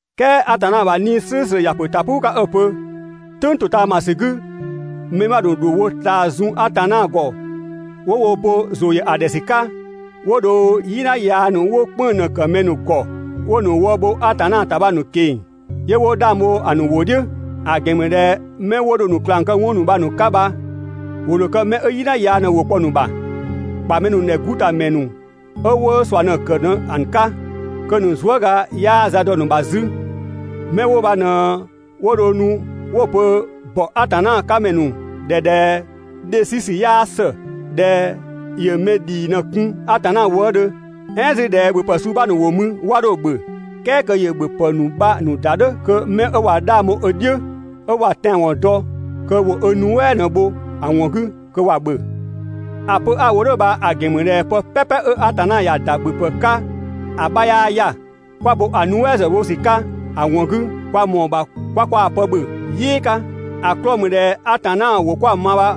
"Kɛɛ Atanna ‑bha 'Nii‑ "slʋ̈ʋ̈slʋ̈ ‑ya ‑pö ‑ta "puu 'ka 'ö‑ pö: «"Tʋ̈ng ‑totaamasü 'gü, mɛ 'bha ‑nu ‑dho wo ꞊taa zun Atanna ‑gɔ 'wo wo bo ‑zʋ ‑yö ‑a ‑dhɛ ‑sü 'ka, 'wo dho "yina yaa ‑nu 'wo "kpënng‑ ꞊në‑ ‑kë mɛ ‑nu ‑gɔ, 'wo‑ ‑nu wë bho Atanna ‑ta bha‑ ‑nu ꞊keng‑, 'yö 'wo 'dhang bho‑ ‑nu ‑wʋ "dhiʋ̈. ‑A ‑gɛn ‑mü ꞊dhɛ 'mɛ 'wo dho‑ ‑nu ꞊klang kë 'wɔn ‑nu bha‑ 'ka bha ‑wo ‑dho kë 'mɛ 'ö "yina yaa ꞊në ‑wʋ kpɔ‑ ‑nu ‑bha, ‑kpa mɛ ‑dhɛ 'gu ‑ta ‑mɛ 'ö 'wo ꞊sua ꞊në‑ ‑kë ꞊në‑ 'ka, kö‑ ‑nu zuëga 'yaa za dɔ‑ ‑nu ‑bha 'zü. 'Mɛ 'wo bha ꞊në 'wo dho nu 'wo‑ pö ‑bɔ Atanna 'ka ‑mɛ ‑nu ‑dhɛ ꞊dhɛ dhe 'sü ‑sü 'yaa ‑së, (꞊dhɛ ‑yö mɛ ‑dhii ꞊në‑ kun Atanna wëëdhö). "Ɛɛn 'zü ꞊dhɛ ‑bhöpë suu 'bha ‑nu ‑wo mü 'wa 'dho‑ ‑bhö, "kɛɛ kö ‑yö ‑bhöpë ‑nu bha‑ ‑nu ‑da "dhʋ̈ kö 'mɛ ꞊wa 'dhang bho ö "dhiʋ̈, 'ö ꞊wa tɛanwɔn dɔ kö ‑wo ö nuɛ" ꞊në‑ bho‑ ‑wɔn 'gü kö ‑wa ‑bhö. ‑A pö 'a‑ wo "dhʋ̈ bha‑ ‑gɛn ‑mü ꞊dhɛ pë "pɛpɛ 'ö Atanna ‑ya ‑da ‑bhöpë 'ka ‑a 'bha 'yaa 'ya‑. 'Kwa bo‑ nuɛ" ‑zë bho ‑sü 'ka ‑a ‑wɔn 'gü, kwa ‑mɔɔ ‑bha 'kwa kwaa pë ‑bhö "yɩɩ 'ka. ‑A 'klɔɔ‑ ‑mü ꞊dhɛ Atanna ‑wʋ 'kwa‑ ma bha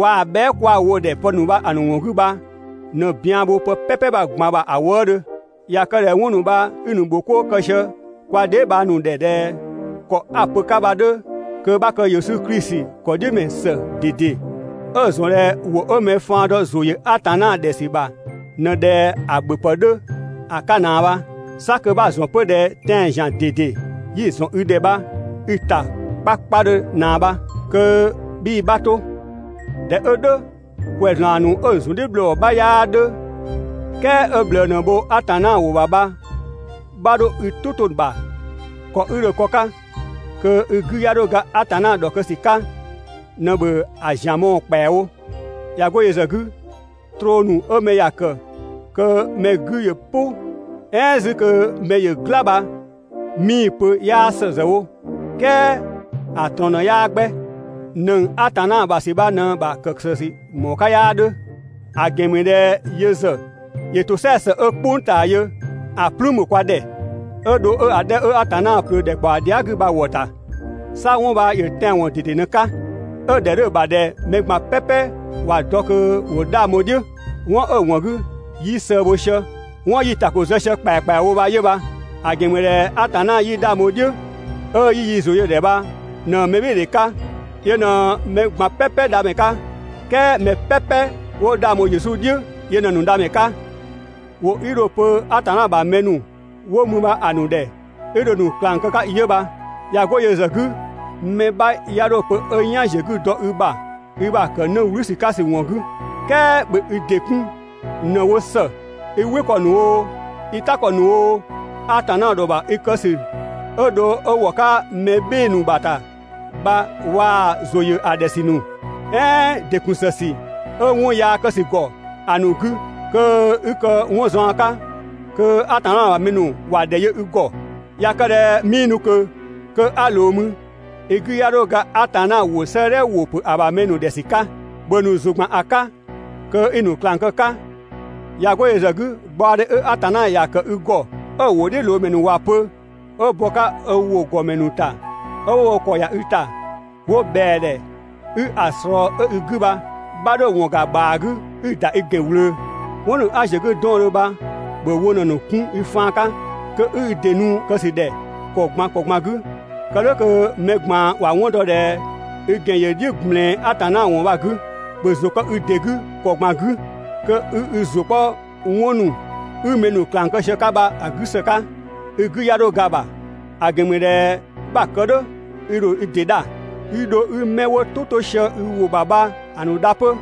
waa‑ bhɛa" 'kwa‑ wo‑ ‑dhɛ pë ‑nu bha‑ ‑nu ‑wɔn 'gü bha ꞊në bian bho pë "pɛpɛ ꞊gban ‑bha ‑a wëëdhö. ꞊Ya kë ꞊dhɛ 'wɔn ‑nu bha 'i‑ ‑nu ‑bho 'koo kë sië kwa dheebhang ‑nu ‑dhɛ ꞊dhɛ ‑kɔ 'a‑ pö‑ 'ka bha‑ 'dhö, kö 'bha kë Yesu Klisi ‑kɔdhiʋ̈dɔmɛ ‑së ꞊dede, 'ö‑ ‑zɔn ꞊dhɛ ‑wʋ 'ö mɛ faan dɔ ‑zʋ ‑yö Atanna ‑dhɛ ‑sü ‑bha ꞊në ꞊dhɛ ‑a ‑bhöpë 'dhö ‑a 'ka ꞊naa bha. 'Sa kö 'bha‑ ‑zɔn 'pö ꞊dhɛ tɛan‑ ‑zian ꞊dede 'yi‑ ‑zɔn i ‑dhɛ bha i‑ ‑ta 'kpakpadhö ꞊naa bha. Kö 'bhii‑ 'bha 'to. ꞊Dhɛ 'ö "dhʋ̈, ‑kwɛzlan ‑nu 'ö‑ ‑zun "dhiʋ̈ ‑bhlɔɔ 'bha 'yaa 'dhö, "kɛɛ 'ö ꞊bhlëë ꞊në‑ bho Atanna ‑wʋ ‑bha bha 'bha 'dho i "tʋ 'to‑ ‑bha. ‑Kɔ 'i dho‑ kë‑ 'ka kö i 'gü 'ya 'dho ga Atanna ‑dhɔkë ‑sü 'ka ꞊në ‑bhö ‑a ‑zian mɔɔ‑ ‑kpɛawo. ꞊Ya 'go yö ‑zë 'gü, troo ‑nu 'ö mɛ ‑ya ‑kë kö mɛ 'gü ‑yö "pʋ, "ɛɛn 'zü kö mɛ ‑yö "gla bha 'mii‑ pö 'yaa ‑së ‑zë wo "kɛɛ ‑a ꞊trɔɔn ꞊në 'yaa 'gbɛ. ‑Nëng Atanna ‑bha ‑sü bha ꞊në‑ ‑bha ‑kë ‑së ‑sü ‑mɔɔ 'ka 'yaa 'dhö. ‑A ‑gɛn ‑mü ꞊dhɛ yö ‑zë ‑yö ‑tosɛa ‑së 'ö "kpʋng ꞊taa yö ‑a "plüün bho kwa ‑dhɛ, 'ö dho 'ö‑ 'dhɛ 'ö Atanna ꞊plöö ‑dhɛkpaɔ dhia" 'gü bha‑ ‑wɔ ‑ta. 'Sa 'wɔn bha ‑yö tɛanwɔn ꞊dede ꞊në‑ 'ka, 'ö‑ ‑dhɛ 'dhö‑ ‑bha ꞊dhɛ mɛ ꞊gban ‑wa dɔ kö ‑wo 'dhang bho‑ "dhiʋ̈. 'Wɔn 'ö‑ ‑wɔn 'gü 'yi sëë bho sië, 'wɔn 'yi‑ ‑ta ‑ko zë sië ‑kpɛakpɛawo bha 'yö bha. ‑A ‑gɛn ‑mü ꞊dhɛ Atanna 'yi 'dhang bho‑ "dhiʋ̈, 'ö 'yi yi ‑zʋ yö‑ ‑dhɛ bha ꞊në "bhɩɩdhe 'ka, yö ꞊në mɛ ꞊gban "pɛpɛ Dhamɛ 'ka, "kɛɛ mɛ "pɛpɛ 'wo 'dhang bho Yesu "dhiʋ̈, yö ꞊në‑ ‑nu Dhamɛ 'ka. ‑Wʋ 'i dho‑ pö Atanna ‑bha mɛ ‑nu 'wo mü bha‑ ‑nu ‑dhɛ 'i dho‑ ‑nu ꞊klang kë‑ 'ka 'yö bha. ꞊Ya 'go yö ‑zë 'gü, mɛ 'bha 'ya 'dho‑ pö 'ö "yan ‑ziö 'gü dɔ i ‑bha i ‑bha ‑kë 'në "wlü ‑sü 'ka ‑sü ‑wɔn 'gü. "Kɛɛ ‑bhö i ‑dɩ 'kun ꞊në‑ wo ‑së i "wɩ ‑kɔ ‑nu oo, i "ta ‑kɔ ‑nu oo, Atanna ‑dhɔ ‑bha i kë ‑sü 'ö dho 'ö ‑wɔ 'ka mɛ "bhɩɩ‑ ‑nu ‑bha ‑ta bha waa‑ ‑zʋ ‑yö ‑a ‑dhɛ ‑sü ‑nu, "ɛɛn ‑dɩ ‑kun ‑së ‑sü 'ö 'wɔn yaa kë ‑sü ‑gɔ ‑a ‑nu 'gü kö 'i kë 'wɔn zɔɔn 'ka, kö Atanna ‑bha mɛ ‑nu ‑wa ‑dhɛ yö i ‑gɔ. ꞊Ya kë ꞊dhɛ 'mii nu ꞊kö kö 'a ꞊loo mü, i 'gü 'ya 'dho ga Atanna ‑wʋ 'sëëdhɛ ‑wʋ ‑pö ‑a ‑bha mɛ ‑nu ‑dhɛ ‑sü 'ka. ‑Bhö ‑a ‑nu ‑zʋ ‑gban ‑a 'ka, kö 'i‑ ‑nu ꞊klang kë‑ 'ka. ꞊Ya 'go yö ‑zë 'gü, gbaɔdhe 'ö Atanna ‑ya ‑kë i ‑gɔ 'ö‑ ‑wʋdhiʋ̈loomɛ ‑nu ‑wa pö, 'ö bɔ‑ 'ka‑ ‑wʋ ‑gɔmɛ ‑nu ‑ta 'ö 'wo wo ‑kɔ ‑ya i ‑ta 'wo ꞊bhɛa‑ ‑dhɛ 'i‑ ꞊slɔɔ 'ö i 'gü bha, 'bha 'dho‑ ‑wɔn ‑ga ‑bhaa 'gü 'i‑ ‑da i ‑gɛn ꞊wlöö. 'Wɔn ‑nu 'a ‑ziö 'gü 'dɔɔndhö bha ‑bhö wo ꞊në‑ ‑nu 'kun i faan 'ka, kö 'i i ‑dɩ nu‑ kë ‑sü ꞊dhɛ ‑kɔ ꞊gban ‑kɔ ꞊gban 'gü, kë "dhʋ̈ kö mɛ ꞊gban ‑wa 'wɔn dɔ ꞊dhɛ i ‑gɛn ‑yö "dhiʋ̈ ꞊gblɛɛn Atanna ‑wɔn bha‑ 'gü. ‑Bhö ‑zʋ kë i ‑dɩ 'gü ‑kɔ ꞊gban 'gü, kö 'i i ‑zʋ 'kpɔ 'wɔn ‑nu 'i mɛ ‑nu ꞊klang kë sië‑ 'ka bha‑ 'gü ‑së 'ka. i 'gü 'ya 'dho ga‑ ‑bha. ‑A ‑gɛn ‑mü ꞊dhɛ 'bha‑ kë "dhʋ̈, i ‑dho i ‑dɩ dha, 'i dho 'i 'mɛ 'wo "tʋ 'to sië i ‑wʋ ‑bha bha‑ ‑nu dha 'pö.